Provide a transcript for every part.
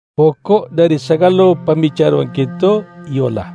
Pokok dari sagalo pambicaro-^ an kito iyolah: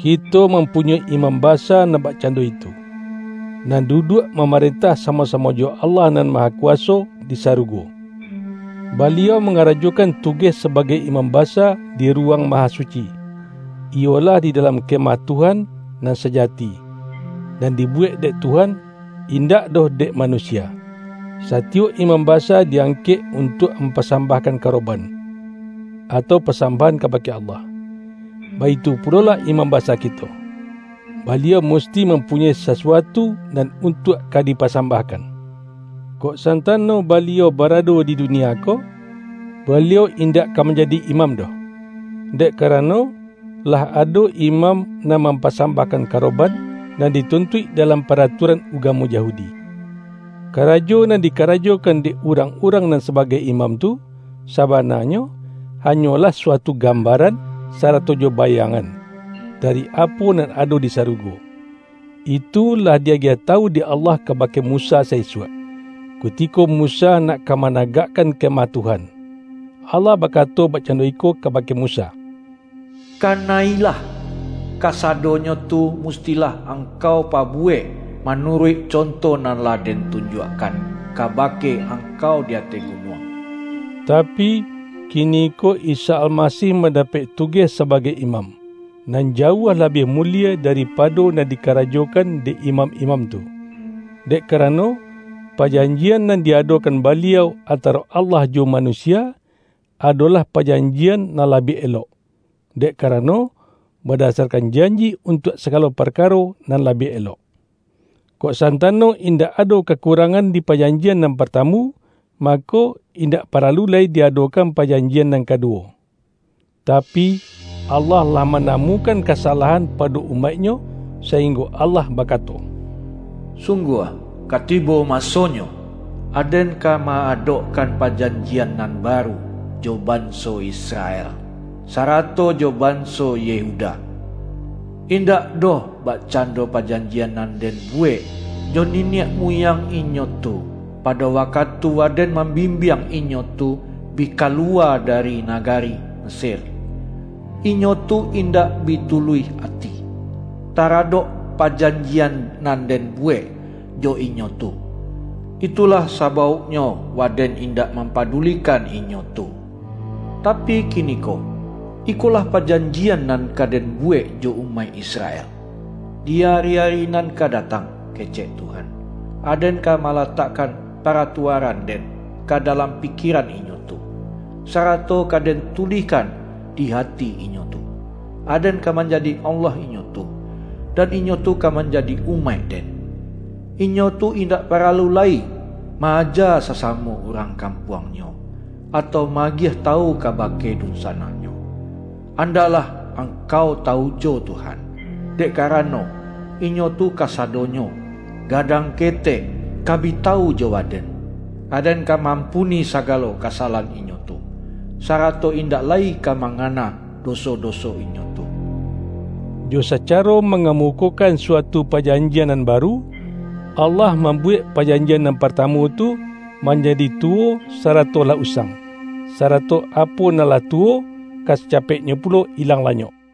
Kito mampunyoi Imam Basa nan bakcando itu, nan duduak mamarentah samo-samo jo Allah Nan Mahakuwaso di sarugo. Baliau mangarajokan tugeh sabagai Imam Basa di Ruwang Mahasuci, iyo-lah di dalam Kemah Tuhan nan saja-ti, nan dibuwek dek Tuhan, indak doh dek manusia. Satiyok imam basa di-angkek un-tuak mampasambahkan karoban, atau pasambahan kabake Allah. Baitu pulolah Imam Basa kito; Baliau mus-ti mampunyoi sasuatu nan untuak ka dipasambahkan. Kok santano Baliau barado di dunia ko, Baliau indak ka manjadi imam doh, dek karano, lah ado imam nan mampasambahkan karoban, nan dituntuik dalam paratua-ran ugamo Yahudi. Karajo nan dika-rajokan dek urang-urang nan sabagai imam tu, sabananyo, hanyolah sua-tu gambaran sarato jo bayangan, dari apo nan ado di sarugo. Itu lah di-agiah tawu dek Allah kabake Musa sa-isuak, kutiko Musa nak ka managakkan Ke-mah Tuhan. Allah bakato bakcando iko kabake Musa,”Kana-ilah! Kasa-donyo tu mustilah angkau pabuwek manuruik conto nan lah Den tunjuak-kan kabake angkau di ateh gunuang.” Tapi, kiniko Isa Almasih mandapek tugeh sabagai Imam, nan jauah labiah mulie daripado nan dikarajokan dek imam-imam tu. Dek karano, pajanji-an nan di-adokan Baliau antaro Allah jo manusia, adolah pajanjian nan la-biah elok, dek karano, badasarkan janji untuak sagalo parkaro nan la-biah elok. Kok santano indak ado kakurang-an di pajanjian nan partamu, mako, indak paralu lai di-adokan pajanjian nan kaduwo. Tapi, Allah lah mana-mukan kasalahan pado umaik-Nyo, sainggo Allah bakato,”Sungguah, ka tibo masonyo, Aden ka ma-adokan pajanjian nan baru jo banso Israel sarato jo banso Yehuda. Indak doh bakcando pajanjian nan Den buwek jo niniak muyang inyo tu, pado wakatu Waden mambimbiang inyo tu bi kaluwa dari nagari Mesir. Inyo tu indak bi tuluih ati, taradok pajanjian nan Den buwek jo inyo tu; itulah sabauknyo Waden indak mampadulikan inyo tu. Tapi kiniko, ikolah pajanjian nan ka Den buwek jo umaik Israel, di ari-ari nan ka datang, kecek Tuhan: Aden ka malatakkan paratuaran-Den ka dalam pikieran inyo tu, sarato ka Den tulihkan di ati inyo tu. Aden ka manjadi Allah inyo tu, nan inyo tu ka manjadi umaik-Den. Inyo tu indak paralu lai ma-aja sasamo urang kampuangnyo, atau ma-agiah tawu kabake dunsanaknyo, ’Andaklah angkau tawu jo Tuhan.’ Dek karano, inyo tu kasadonyo, gadang ketek, ka bi tawu jo Waden. Aden ka ma-ampuni sagalo kasalahan inyo tu, sarato indak lai ka mangana doso-doso inyo tu.” Jo sacaro mangamukokan suatu pa-janjian nan baru, Allah mambuwek pajanjian nan partamu tu, manjadi tuwo sarato lah usang; sarato apo nan lah tuwo, ka sacapeknyo pulo ilang lanyok.